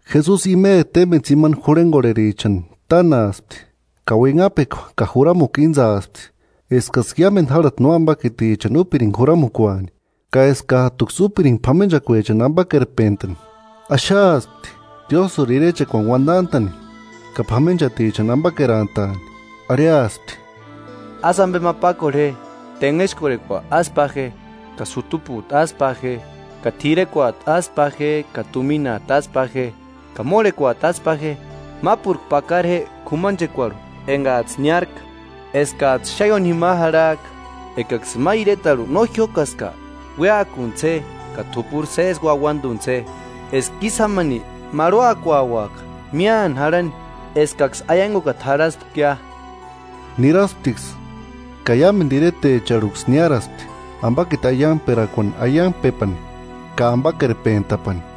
Jesusi imeri témbeni tsimani jurhengorherichani tánaaspti, ka uinhapekua ka juramukua íntsaspti, eskaksï iámendu járhati nóambakitichani úpiringa juramukuani, ka eskajtuksï úpiringa p'amenchakuechani ambakerpentani. Axaaspti Diósïri irechekuani uandantani ka p'amenchatichani ambakerantaani. Arhiaspti: Ásï ambe ma pákorhe je: –Tenhexkorhekua ásï pa je, ka sutupujtu ásï pa je, ka t'irekuajtu ásï pa je, ka tuminajtu ásï pa je, ka mórhekuajtu ásï pa je. Mápurku pakara je k'umanchekuarhu engajtsï niárka, eskajtsï xáni ióni jima jarhajka. Ekaksïni ma iretarhu no jiókaska, uéakuntsï je ka t'upuri sési uauanduntsï je, eska ísï jámani marhuakuauaka míani jarhani eskaksï aiangukata jarhaspkia. Nirasptiksï ka iámendu iretecharhuksï niáraspti, ambakiti aiangperakuani aiangpepani ka ambakerpentapani.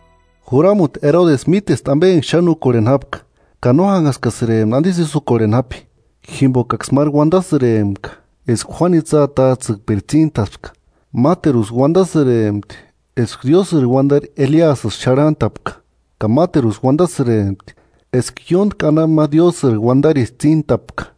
Juramuti Erodesi mítespti ambe enga xáni úkorheni jápka; ka no jánhaskasïrempti andisï ísï úkorheni jápi, jimbokaksï máru uandasïrempka eska Juánu itsï atajtsïkpiri tsíntaspka; máteruksï uandasïrempti eska Diósïri uandari Eliasïsï xarhantapka; ka máteruksï uandasïrempti, eska ióntki anapu ma Diósïri uandarisï tsíntapka.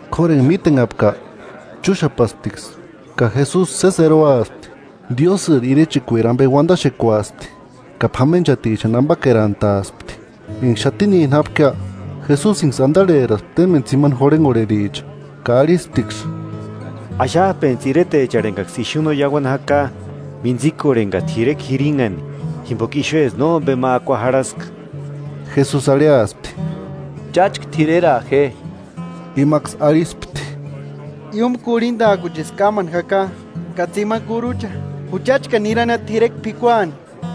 K'óru enga mítenhapka, chúxapasptiksï, ka Jesusi sési eroaspti, Diósïri irechekueri ambe uandaxekuaspti ka p'amenchatichani ambakerantaaspti. Enga xatinini jápkia, Jesusinksï andarheraspti témbeni tsimani jurhengorhericha ka arhisptiksï: –Axajpentsï iretecharhu engaksï ixu no iauani jaka, mintsikorheni ka t'irekua jirinhani, jimboka ixuesï nómbema akua jarhaska. Jesusi arhiaspti: –Cháchka t'ireraa je. Imaksï arhispti: –Iúmu kurhindajkuchisï kámani jaka ka tsimani kurucha, juchachkani nirania t'irekua p'ikuani.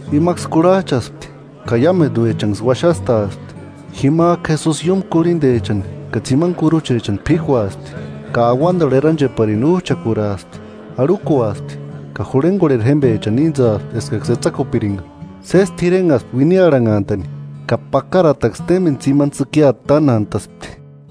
Imaksï kurhajchaspti ka iámenduechanksï uaxastaaspti. Jimajku Jesusi iúmu kurhindechani ka tsimani kuruchechani p'íkuaspti, ka auandarhu erancheparini újchakuraaspti, arhukuaspti ka jurhengorheri jémbechani íntsaaspti eskaksï etsakupiringa. Sési t'irenhaspti uiniarhanhantani, ka pakarataksï témbeni tsimani tsïkiata tánantaspti.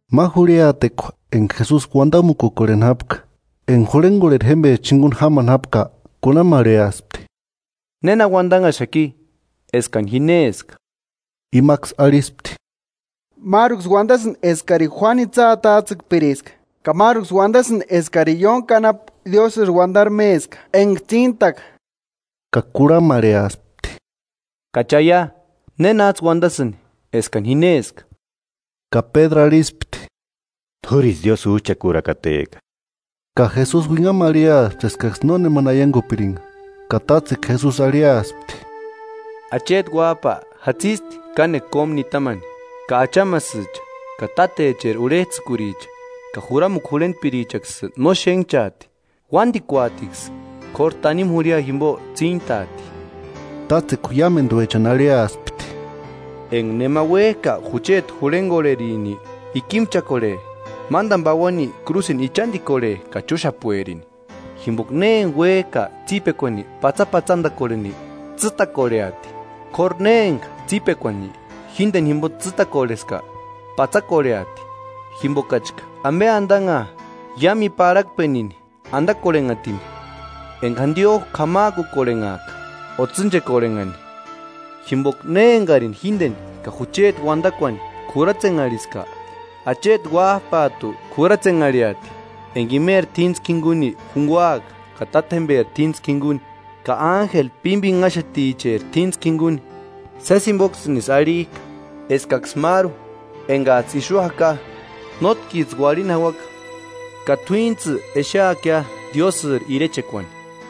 Ma jurhiatekua enga Jesusi uandamukukorheni jápka, enga jurhengorheri jémbecha jinguni jámani jápka, kurhamarheaspti: –¿Néna uandanhaxaki, eskani ji néska? Imaksï arhispti: –Máruksï uandasïndi eskari Juánu itsï atajtsïkpiriska, ka máruksï uandasïndi eskari ióntki anapu Diósïri uandari méska enga tsíntaka. Ka kurhamarheaspti: –¿Ka cháia, nénajtsï uandasïnki, eskani ji néska? Ka Pédru arhispti: –T'úrisï Diósïri újchakurakateka. Ka Jesusi uinhamu arhiaspti eskaksï nónemani aiangupiringa. Ka tátsekua Jesusi arhiaspti: –Acheti Uájpa jatsisti kánekua kómu nitamani, ka achamasïcha ka tátecheri urhejtsïkuricha ka juramukua jurhentpirichaksï no xénhchaati. Uándikuatiksï, k'óru tanimu jurhia jimbo tsíntaati. Tátsekua iámenduechani arhiaspti: –Enga nema uéjka jucheti jurhengorherini, ikimchakorhe, mándani pauani krúsini ichandikorhe ka chúxapuerini. Jimboka ne enga uékajka tsípekuani patsapatsandakorheni, tsîtakorheati; k'óru ne enga tsípekuani jíndeni jimbo tsîtakorheska, patsakorheati. Jimbokachka, ¿Ambe andanhaa iámu i parhakpenini andakorhenhatini enga jandiojku k'amajkukorhenhaaka o tsînchekorhenhani? Jimboka ne engarini jíndeni ka jucheti uandakuani k'uratsenharhiska, acheti Uájpajtu k'uratsenharhiati enga imeri t'íntskua jinguni junguaaka ka tátjemberi t'íntskua jinguni ka ánjeli pímbinhaxeticheri t'íntskua jinguni. Sési jimboksïnisï arhijka eskaksï máru engajtsï ixu jaka, nótkijtsï uarhini jauaka ka t'uínijtsï exeakia Diósïri irechekuani.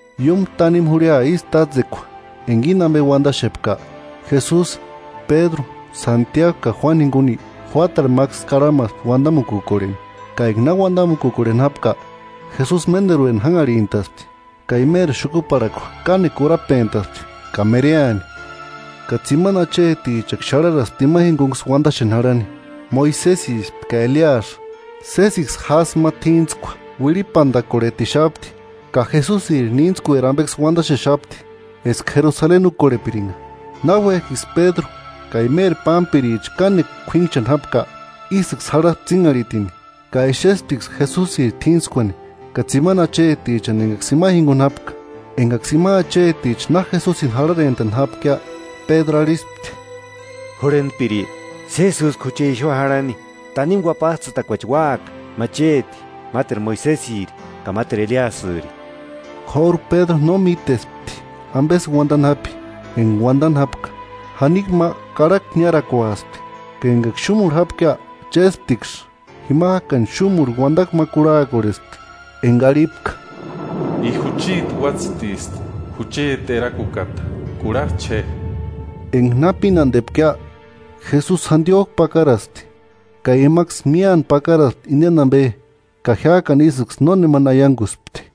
Iúmu tanimu jurhia ísï tátsekua enga íni ambe uandaxepka, Jesusi, Pédru, Santiagu ka Juánuni jinguni juátarhu máksï karhamaspti uandamukukorheni. Ka enga na uandamukukorheni jápka Jesusi ménderueni jánharhintaspti, ka imeri xukuparhakua kánekua urapentaspti ka mereani; ka tsimani achetichaksï xarharaspti ima jingunksï uandaxeni jarhani. Moisesispti ka Eliasï, sésiksï jásï ma t'íntskua uirhipandakorhetixapti ka Jesusiri níntskueri ambeksï uandaxexapti, eska Jerusaleni úkorhepiringa. Náuejkiksï Pédru ka imeri pámpiricha kánekua k'uínchani jápka, ísïksï jarhaspti tsínharhitini, ka exesptiksï Jesusiri t'íntskuani ka tsimani achetichani engaksï ima jinguni jápka. Engaksï ima acheticha na Jesusini jarharentani jápkia, Pédru arhispti: –Jurhentpiri, ¡Sési úska jucha ixu jarhani! Tanimu uapajtsïtakuachi úaka: Ma chéti, máteru Moisesiri ka máteru Eliasïri. K'óru Pédru no mítespti ambesï uandani jápi. Enga uandani jápka, janikua ma karhakua niarakuaspti, ka engaksï xúmurhu jápkia chésptiksï. Jimajkani xúmurhu uandakua ma kurhakorhespti, enga arhipka: “I jucheti Uátsïtisti, jucheti Erakukata: Kurhajcha je.” Enga na pínandepkia, Jesusi jandiojku pakaraspti. Ka imaksï míani pakaraspti indeni ambe ka jiákani ísïksï nónemani aianguspti.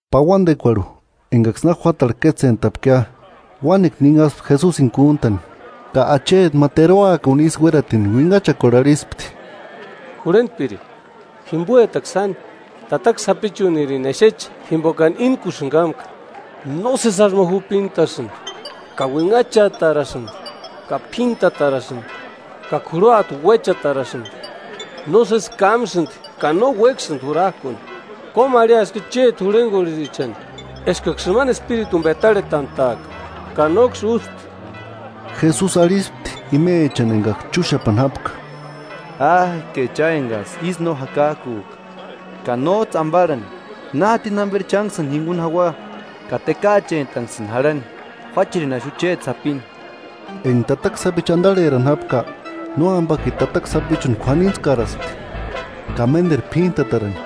Pauandekuarhu engaksï na juátarhu kétsentapkia, uánekua ninhaspti Jesusini kúntani. Ka acheti ma teruakuni isï uératini uinhachakuarhu arhispti: –Jurhentpiri, jimboatakua sáni, tataka sapichunirini exeche jimbokani íntkusïni kámka; nósesi jásï ma jupintasïndi, ka uinhachatarasïndi ka p'íntatarasïndi ka k'uruata uéchatarasïndi. Nósesi kámasïndi ka no uéksïndi jurajkuni. Kómarhiaskia chéti jurhengorherichani eskaksï imani espirituni petarhetantaaka, ka nóksï ústi. Jesusi arhispti imechani engaksï chúxapani jápka: –¡Áke cha engajtsï ísï no jakajkujka ka nójtsï ambarhani! ¿Na jatini jamberi chánksïni jinguni jaua ka tekaachentanksïni jarhani? Juácherini axu chéti sapini. Enga tataka sapichu andarherani jápka, nóambakiti tataka sapichuni k'uanintskaraspti ka ménderu p'íntatarani;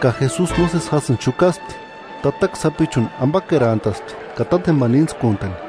ka Jesusi nósesi jásïni xukaspti, tataka sapichuni ambakerantaspti ka tátjembani íntskuntani.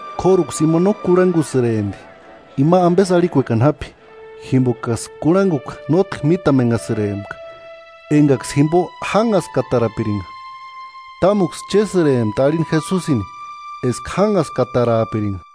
K'óruksï ima no kurhangusïrempti ima ambesï arhiani jápi, jimbokaksï kurhangukua nótki mítamenhasïrempka engaksï jimbo jánhaskatarapiringa; támtuksï chésïrempti arhini Jesusini eska jánhaskataraapiringa.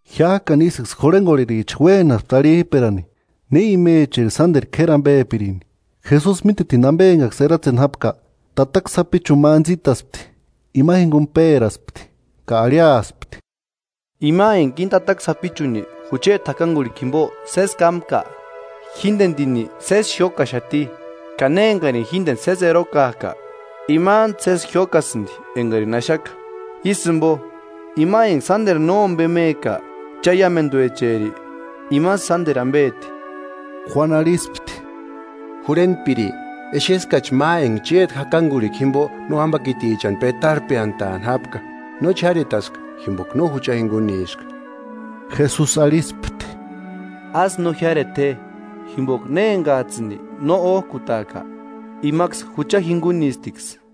Jiájkani isïksï jurhengorhericha uénaspti arhijperani ne imecheri sánderu k'éri ambepirini. Jesusi mítetini ambe eskaksï eratseni jápka, tataka sapichuni ma antsïtaspti, ima jinguni péraspti, ka arhiaspti: –Ima enga íni tataka sapichuni jucheti jakangurhikua jimbo sési kámka, jíndendini sési jiókaxati, ka ne engarini jíndeni sési erokajka, imantu sési jiókasïndi engarini axaka. Ísï jimbo, ima enga sánderu nómbemeka cha iámenduecheri, imasï sánderu ambeti. Juánu arhispti: –Jurhentpiri, exeskachi ma enga chéti jakangurhikua jimbo nóambakitichani pétarhpeantaani jápka; nóchi jiaretaska, jimboka no jucha jinguniska. Jesusi arhispti: –Ásï no jiáreta je, jimboka ne engajtsïni no ójkutajka, imaksï jucha jingunistiksï.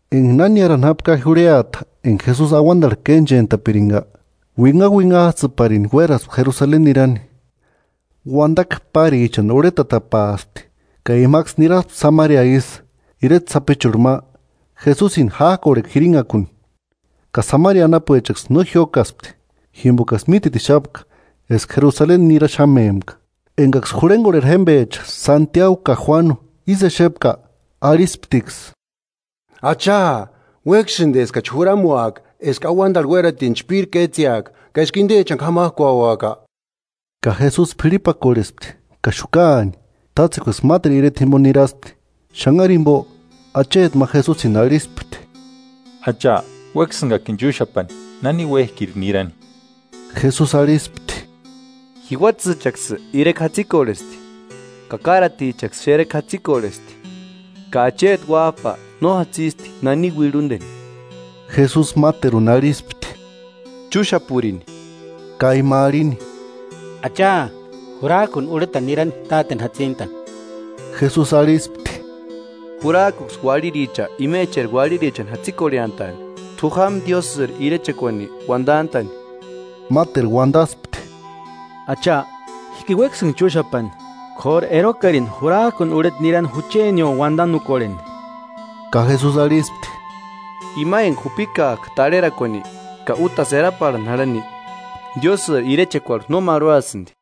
Enga na niárani jápkia jurhiata enga Jesusi auandarhu kénchentapiringa, uinhauinhajtsïparini uéraspti Jerusaleni nirani. Uandakua párichani urhetatapaaspti, ka imaksï niraspti Samaria isï, ireta sapichurhu ma, Jesusini jájkorhekua jirinhakuni; ka Samaria anapuechaksï no jiókaspti, jimbokaksï mítetixapka eska Jerusaleni niraxamempka. Engaksï jurhengorheri jémbecha Santiagu ka Juánu ísï exepka, arhisptiksï: –Acha, ¿Uéksïndi eskachi juramuaka eska auandarhu uératini chpíri kétseaka, ka eska indechani k'amajkuauaka? Ka Jesusi p'irhipakorhespti ka xukaani. Tátsekuaksï máteru ireta jimbo niraspti. Xanhari jimbo, acheti ma Jesusini arhispti: –Acha, uéksïngakini chúxapani nani uéjkiri nirani. Jesusi arhispti: –Jiuatsïchaksï irekua jatsikorhesti ka káratichaksï xerekua jatsikorhesti; ka acheti Uájpa no jatsisti nani uirhundeni. Jesusi máteruni arhispti: –Chúxapurini. Ka ima arhini: –Acha, jurajkuni urheta nirani táteni jatsintani. Jesusi arhispti: –Jurajkuksï uarhiricha imecheri uarhirichani jatsikorheantaani; t'u jáma Diósïri irechekuani uandantani. Máteru uandaspti: –Acha, jíkini uéksïnga chúxapani, k'óru erokarini, jurajkuni urheta nirani juchenio uandanukorheni. Ka Jesusi arhispti: –Ima enga jupikajka tarherakuani ka útasï eraparhani jarhani, Diósïri irechekuarhu no marhuasïndi.